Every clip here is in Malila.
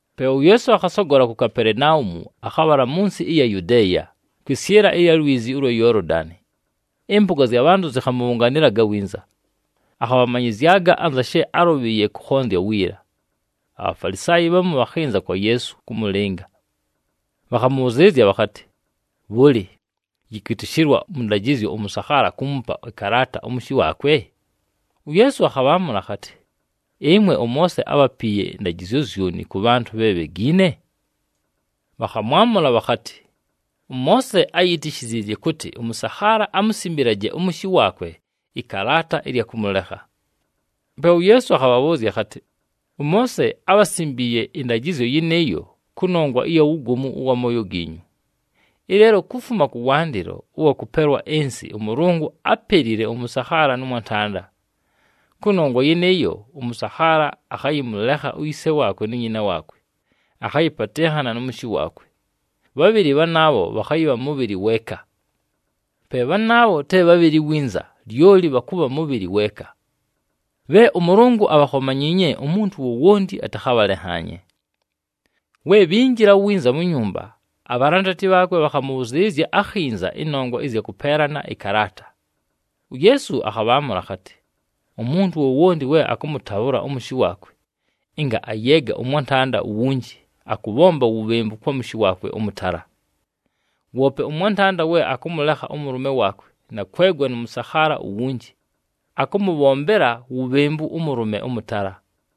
Pe uYeesu akhasogola ku Kapelenaumu, akhabhala mʉ nsɨ ɨya Yudeeya, kwɨsyɨla ɨya lwizi ʉlwa Yoolodani. Ɨmpʉga zya bhantʉ zɨkhamʉbhʉnganɨlaga winza. Akhabhamanyɨzyaga anza she álʉbhɨɨye kʉkhonzya wiila. ABhafalisaayi bhamu bhakhɨnza kwa Yeesu kʉmʉlɨnga. Bhakhamʉbhʉzɨɨlɨzya bhakhatɨ, “Bhʉlɨ, yɨkwɨtɨshɨlwa mʉ ndajɨzyo ʉmʉsakhaala kuumupa ɨkalaata ʉmʉshɨ waakwe?” UYeesu akhabhaamʉla akhatɨ, “Ɨmwe ʉMoose ábhapiiye ndajɨzyo zyoni kʉ bhantʉ bhe bhegiine?” Bhakhamwamʉla bhakhatɨ, “ɄMoose áyitishiziizye kʉtɨ ʉmʉsakhaala amusimbilaje ʉmʉshɨ waakwe ɨkalaata ɨlya kʉmʉlekha.” Pe uYeesu akhabhabhʉʉzya akhatɨ, “ɄMoose ábhasimbiiye ɨndajɨzyo yɨnɨɨyo kʉnongwa ɨya wugomu ʉwa mooyo giinyu. Ɨleelo kufuma kʉwandɨlo ʉwa kʉpelwa ɨnsɨ ʉMʉlʉngʉ ‘ápelile ʉmʉsakhaala nʉ mwantanda.’ ‘Kʉnongwa yɨnɨɨyo, ʉmʉsakhaala akhayɨmʉlekha uyise waakwe nu nyina waakwe, akhayɨpatɨnhana nʉ mʉshɨ waakwe. Bhabhɨlɨ bhanaabho bhakhayɨbha mʉbhɨlɨ weeka.’ Pe bhanaabha te bhabhɨlɨ winza, lyoli bhakʉbha mʉbhɨlɨ weeka. Bhe ʉMʉlʉngʉ abhakhomanyiinye, umuntu wowonti atakhabhalenhaanye.” We bhinjila winza mu nyumba, abhalandati bhaakwe bhakhamʉbhʉzɨɨlɨzya akhinza ɨnongwa ɨzya kʉpeelana ɨkalaata. UYeesu akhabhaamʉla akhatɨ, “Umuntu wowonti we akʉmʉtabhʉla ʉmʉshɨ waakwe, ɨnga ayeega ʉmwantanda uwunji, akʉbhomba wubhembu kwa mʉshɨ ʉmʉtala. Woope ʉmwantanda we akʉmʉlekha ʉmʉlʉme waakwe na kwegwa nʉ mʉsakhaala uwunji, akʉmʉbhombela wubhembu ʉmʉlʉme ʉmʉtala.”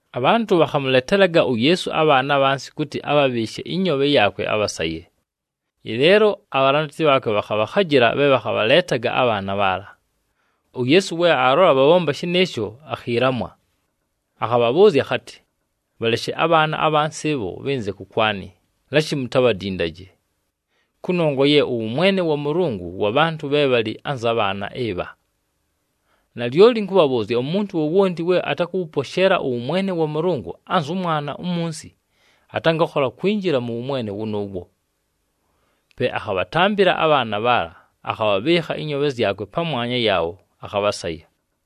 Abhantʉ bhakhamʉletelaga uYeesu abhaana abhansi kʉtɨ abhabhɨɨshe ɨnyoobhe yaakwe abhasaye. Ɨleelo abhalandati bhaakwe bhakhabhakhajɨla bhe bhakhabhaleetaga abhaana bhaala. UYeesu we aalola bhabhomba shɨnɨɨsho, akhiilamwa. Akhabhabhʉʉzya akhatɨ, “Bhaleshe abhaana abhansi ɨbho bhɨnze kʉkwanɨ, lashi mutabhadindaje! Kʉnongwa ye ʉwʉmwene wa Mʉlʉngʉ wa bhantʉ bhe bhalɨ anza bhaana ɨbha. Nalyoli ɨnkʉbhabhʉʉzya, umuntu wowonti we atakʉwʉposheela ʉwʉmwene wa Mʉlʉngʉ anzʉ mwana umunsi, atangakhola kwinjila mʉ wʉmwene wʉnʉʉwo.” Pe akhabhatambɨla abhaana bhaala, akhabhɨɨkha ɨnyoobhe zyakwe pamwanya yaabho, akhabhasaya.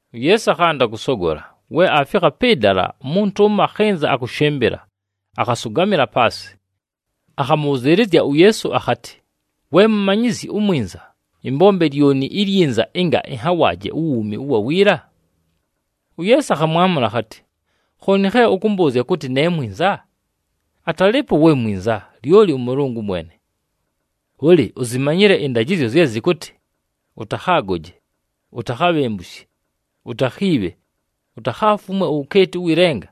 UYeesu akhanda kʉsogola, we aafikha pɨ dala, umuntu ʉmo akhɨnza akʉshɨmbɨla, akhasʉgamɨla paasɨ. Akhamʉbhʉzɨɨlɨzya uYeesu akhatɨ, “We Mumanyizyi uMwinza, ɨmbombe lyoni ilyinza ɨnga ɨnhawaaje uwuumi ʉwa wiila?” UYeesu akhamwamʉla akhatɨ, “Khooni khe ʉkʉmbʉʉzya kʉtɨ ne mwinza? Atalɨɨpo we mwinza, lyoli ʉMʉlʉngʉ mwene. Bhʉlɨ, uzimanyile ɨndajɨzyo zye zɨkʉtɨ, ‘Ʉtakhaagoje, utakhabhembushe, utakhiibhe, utakhaafumwe uwukeeti ʉwɨ lenga,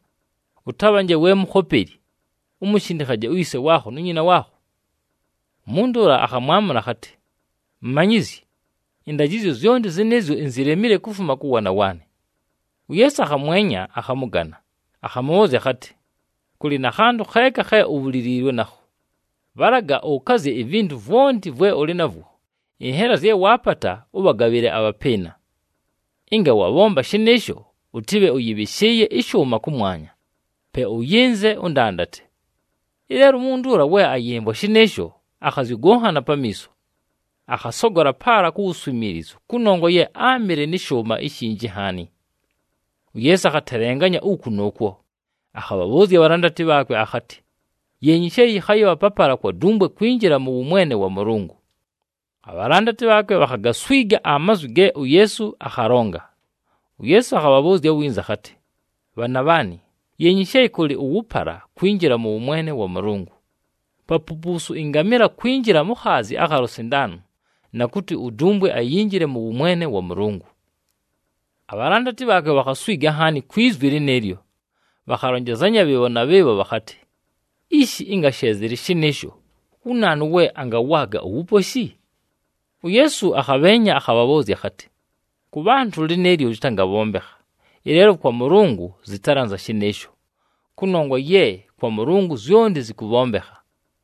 ʉtabhanje we mukhopeli, umushindikhaje uyise waakho nu nyina waakho.’” Umuntu ʉla akhamwamʉla akhatɨ, “Mumanyizyi, ɨndajɨzyo zyonti zɨnɨɨzyo inzilemile kufuma kʉ waana waanɨ.” UYeesu akhamwenya, akhamʉgana, akhamʉbhʉʉzya akhatɨ, “Kʉlɨ na khantʉ kheeka khe ubhuliliilwe nakho. Bhalaga ʉkazye ivintu vwonti vwe ʉlɨ navwo, ɨnhela zye waapata, ʉbhagabhɨle abhapɨɨna. Ɨnga wabhomba shɨnɨɨsho, ʉtɨbhe ʉyɨbhɨshɨɨye ɨshʉʉma kʉmwanya. Pe ʉyɨnze, ʉndandate.” Ɨleelo umuntu ʉla we ayɨmvwa shɨnɨɨsho, akhazyʉgʉkhana pamiiso. Akhasogola paala ku wuswimiilizu kʉnongwa ye áamɨle nɨ shʉʉma ishinji nhaani. UYeesu akhatelenganya uku nʉʉkwo, akhabhabhʉʉzya abhalandati bhaakwe akhatɨ, “Yeenyi she yɨkhayɨbha papala kwa dumbwe kwinjila mʉ wʉmwene wa Mʉlʉngʉ.” Abhalandati bhaakwe bhakhagaswiga amazwi ge uYeesu akhalonga. UYeesu akhabhabhʉʉzya winza akhatɨ, “Bhaana bhaanɨ, yeenyi she kʉlɨ ʉwʉpala kwinjila mʉ wʉmwene wa Mʉlʉngʉ. Papupuusu ɨngamɨla kwinjila mu khaazi akha lusindaani, na kʉtɨ udumbwe ayinjile mʉ wʉmwene wa Mʉlʉngʉ!” Abhalandati bhaakwe bhakhaswiga nhaani kwi zwi lɨnɨɨlyo. Bhakhalonjezanya bhɨɨbho na bhɨɨbho bhakhatɨ, “Ishi, ɨnga she zɨlɨ shɨnɨɨsho, wu naanu we angawaaga uwuposhi?” UYeesu akhabheenya, akhabhabhʉʉzya akhatɨ, “Kʉ bhantʉ lɨnɨɨlyo lɨtangabhombekha, ɨleelo kwa Mʉlʉngʉ zɨtalɨ anza shɨnɨɨsho, kʉnongwa ye kwa Mʉlʉngʉ zyonti zɨkʉbhombekha.”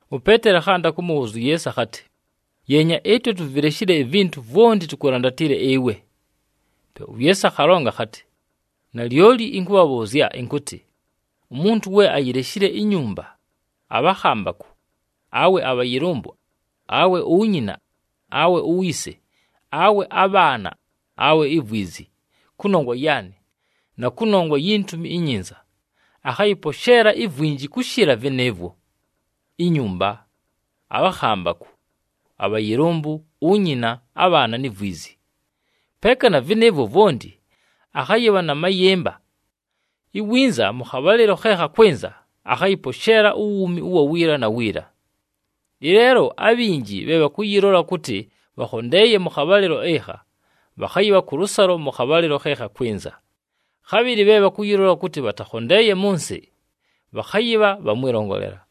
UPeeteli akhanda kʉmʉbhʉʉzya uYeesu akhatɨ, “Yeenya, ɨtwe tuvileshile ivintu vwonti, tukulandatile ɨwe!” Pe uYeesu akhalonga akhatɨ, “Nalyoli ɨnkʉbhabhʉʉzya ɨnkʉtɨ, umuntu we ayileshile inyumba, abhakhambakʉ, awe abhayɨlʉmbʉ, awe unyina, awe uyise, awe abhaana, awe ivwizi, kʉnongwa yaanɨ, na kʉnongwa yi Ntumi iNyinza, akhayɨposheela ivwinji kʉshɨla vɨnɨɨvwo: inyumba, abhakhambakʉ, abhayɨlʉmbʉ, unyina, abhaana ni vwizi. Peeka na vɨnɨɨvwo vwonti, akhayɨbha na mayɨmba. Iwinza mʉ khabhalɨlo khe khakwɨnza akhayɨposheela uwuumi ʉwa wiila na wiila. Ɨleelo abhinji bhe bhakʉyɨlola kʉtɨ bhakhondeeye mʉ khabhalɨlo ɨkha, bhakhayɨbha kʉlʉsalo mʉ khabhalɨlo khe khakwɨnza, khabhɨlɨ bhe bhakʉyɨlola kʉtɨ bhatakhondeeye mʉ nsɨ, bhakhayɨbha bha mwɨlongolela.”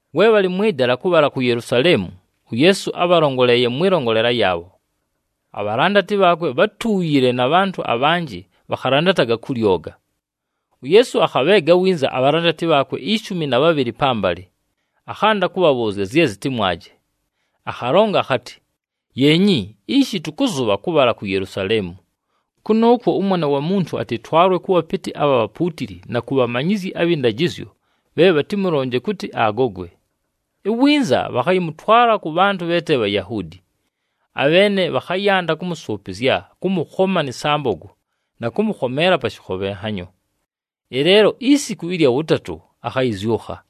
We bhalɨ mwɨ dala kʉbhala ku Yelusaleemu, uYeesu ábhalongoleeye mwɨlongolela yaabho. Abhalandati bhaakwe bhátuuyile, na bhantʉ abhanjɨ bhakhalandataga kʉ lyoga. UYeesu akhabheega winza abhalandati bhaakwe ishumi na bhabhɨlɨ pambalɨ, akhanda kʉbhabhʉʉzya zye zɨtɨmwaje. Akhalonga akhatɨ, “Yeenyi, ishi tʉkʉzʉbha kʉbhala ku Yelusaleemu. Kʉnʉʉkwo ʉMwana wa Muntu atɨtwalwe kʉ bhapɨtɨ abha bhapuutili na ku bhamanyizyi abhɨ ndajɨzyo bhe bhatɨmʉlonje kʉtɨ agogwe. Iwinza bhakhayɨmʉtwala kʉ bhantʉ bhe te Bhayahuudi. Abheene bhakhayanda kʉmʉsʉʉpɨzya, kʉmʉkhoma nɨ sambogo na kʉmʉkhomeela pa shɨkhobhenhanyo. Ɨleelo isiku ɨlya wʉtatʉ akhayɨzyʉkha.”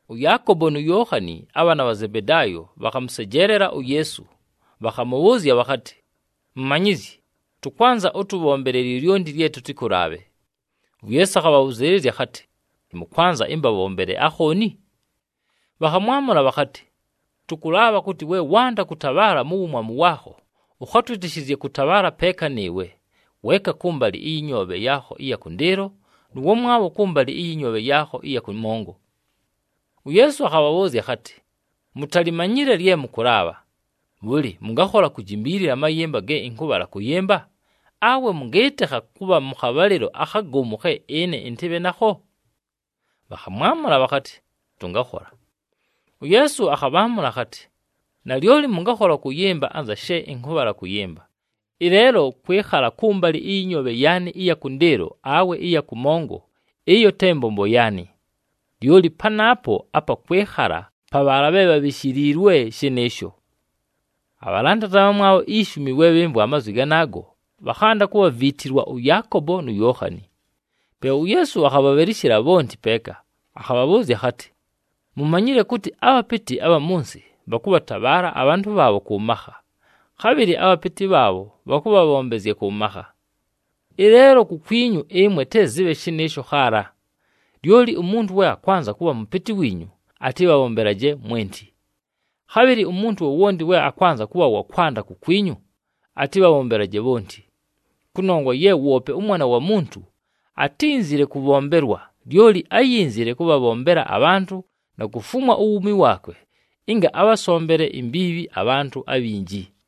ɄYaakobo nu Yookhani, abhaana bha Zebedaayo, bhakhamʉsejeelela uYeesu bhakhamʉbhʉʉzya bhakhatɨ, “Mumanyizyi, tʉkwanza ʉtʉbhombele lyolyonti lye tʉtɨkʉlaabhe.” UYeesu akhabhabhʉzɨɨlɨzya akhatɨ, “Mʉkwanza ɨmbabhombele akhooni?” Bhakhamwamʉla bhakhatɨ, “Tʉkʉlaabha kʉtɨ, we wanda kʉtabhaala mu wumwamu waakho ʉkhatwɨtɨshɨzye kʉtabhaala peeka nɨɨwe, weeka kʉmbalɨ ɨyɨ nyoobhe yaakho ɨya kʉndɨɨlo, nʉ wamwabho kʉmbalɨ ɨyɨ nyoobhe yaakho ɨya kʉmongo.” UYeesu akhabhabhʉʉzya akhatɨ, “Mutalimanyile lye mʉkʉlaabha. Bhʉlɨ, mʉngakhola kujimbiilila amayɨmba ge ɨnkʉbhala kʉyɨmba, awe mʉngɨɨtɨkha kʉbha mʉ khabhalɨlo akhagomu khe ɨne ɨntɨbhe nakho?” Bhakhamwamʉla bhakhatɨ, “Tʉngakhola.” UYeesu akhabhaamʉla akhatɨ, “Nalyoli mʉngakhola kʉyɨmba anza she ɨnkʉbhala kʉyɨmba. Ɨleelo kwɨkhala kʉmbalɨ ɨyɨ nyoobhe yaanɨ ɨya kʉndɨɨlo awe ɨya kʉmongo, ɨyo te mbombo yaanɨ. Lyoli panaapo apa kwɨkhakhala pa bhaala bhe bhabhishiliilwe shɨnɨɨsho.” Abhalandati abhamwabho ishumi we bhɨmvwa amazwi ganaago, bhakhanda kubhaviitilwa ʉYaakobo nu Yookhani. Pe uYeesu akhabhabhɨlɨshɨla bhonti peeka, akhabhabhʉʉzya akhatɨ, “Mumanyile kʉtɨ abhapɨtɨ abha mʉ nsɨ bhakʉbhatabhaala abhantʉ bhaabho kʉ makha, khabhɨlɨ abhapɨtɨ bhaabho bhakʉbhabhombezya kʉ makha. Ɨleelo kukwinyu ɨmwe te zɨbhe shɨnɨɨsho khaala. Lyoli umuntu we akwanza kʉbha mʉpɨtɨ wiinyu, atɨbhabhombelaje mwenti. Khabhɨlɨ umuntu wowonti we akwanza kʉbha wa kwanda kukwinyu, atɨbhabhombelaje bhonti. Kʉnongwa ye woope ʉMwana wa Muntu atínzile kʉbhombelwa, lyoli áyinzile kʉbhabhombela abhantʉ na kufumwa uwuumi waakwe ɨnga abhasombele imbiibhi abhantʉ abhinji.”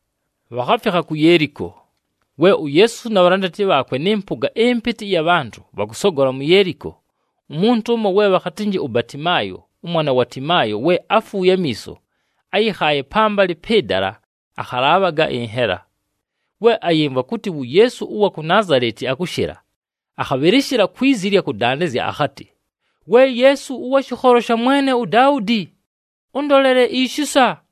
Bhakhafikha ku Yeeliko. We uYeesu na bhalandati bhaakwe nɨ mpʉga ɨmpɨtɨ ɨya bhantʉ bhakʉsogola mu Yeeliko, umuntu ʉmo we bhakhatɨnjɨ uBatimaayo, ʉmwana wa Timaayo we áfuuye amiiso, áyɨkhaaye pambalɨ pɨ dala akhalaabhaga ɨnhela. We ayɨmvwa kʉtɨ wu Yeesu ʉwa ku Naazaleti akʉshɨla, akhabhɨlɨshɨla kwi zi ɨlya kʉdandɨzya akhatɨ, “We Yeesu, ʉwa shɨkholo sha mwene uDaudi, ʉndolele ishisa!”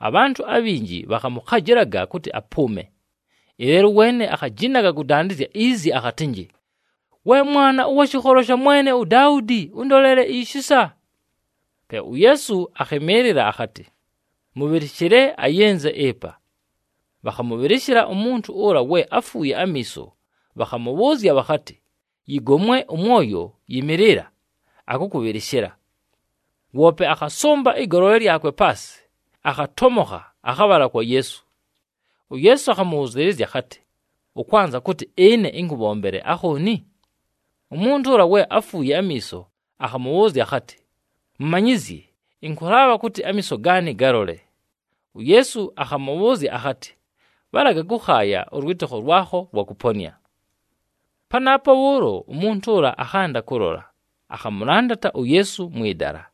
Abhantʉ abhinji bhakhamʉkhajɨlaga kʉtɨ apʉʉme. Ɨleelo ʉweene akhajinaga kʉdandɨzya izi akhatɨnjɨ, “We Mwana ʉwa shɨkholo sha mwene uDaudi, ʉndolele ishisa.” Pe uYeesu akhɨmɨɨlɨla akhatɨ, “Mʉbhɨlɨshɨle ayɨnze ɨpa.” Bhakhamʉbhɨlɨshɨla umuntu ʉla we áfuuye amiiso, bhakhamʉbhʉʉzya bhakhatɨ, “Yɨgomwe ʉmwoyo, yɨmɨɨlɨla! Akʉkʉbhɨlɨshɨla.” Woope akhasʉmba ɨgolole lyakwe paasɨ, akhatomokha, akhabhala kwa Yeesu. UYeesu akhamʉbhʉzɨɨlɨzya akhatɨ, “Ʉkwanza kʉtɨ ɨne ɨnkʉbhombele akhooni?” Umuntu ʉla we áfuuye amiiso akhamʉbhʉʉzya akhatɨ, “Mumanyizyi, ɨnkʉlaabha kʉtɨ amiiso gaanɨ galole.” UYeesu akhamʉbhʉʉzya akhatɨ, “Bhalaga kʉkhaaya, ʉlwɨtɨkho lwakho lwakʉponɨa.” Panaapo bhʉʉlo, umuntu ʉla akhanda kʉlola, akhamʉlandata uYeesu mwɨ dala.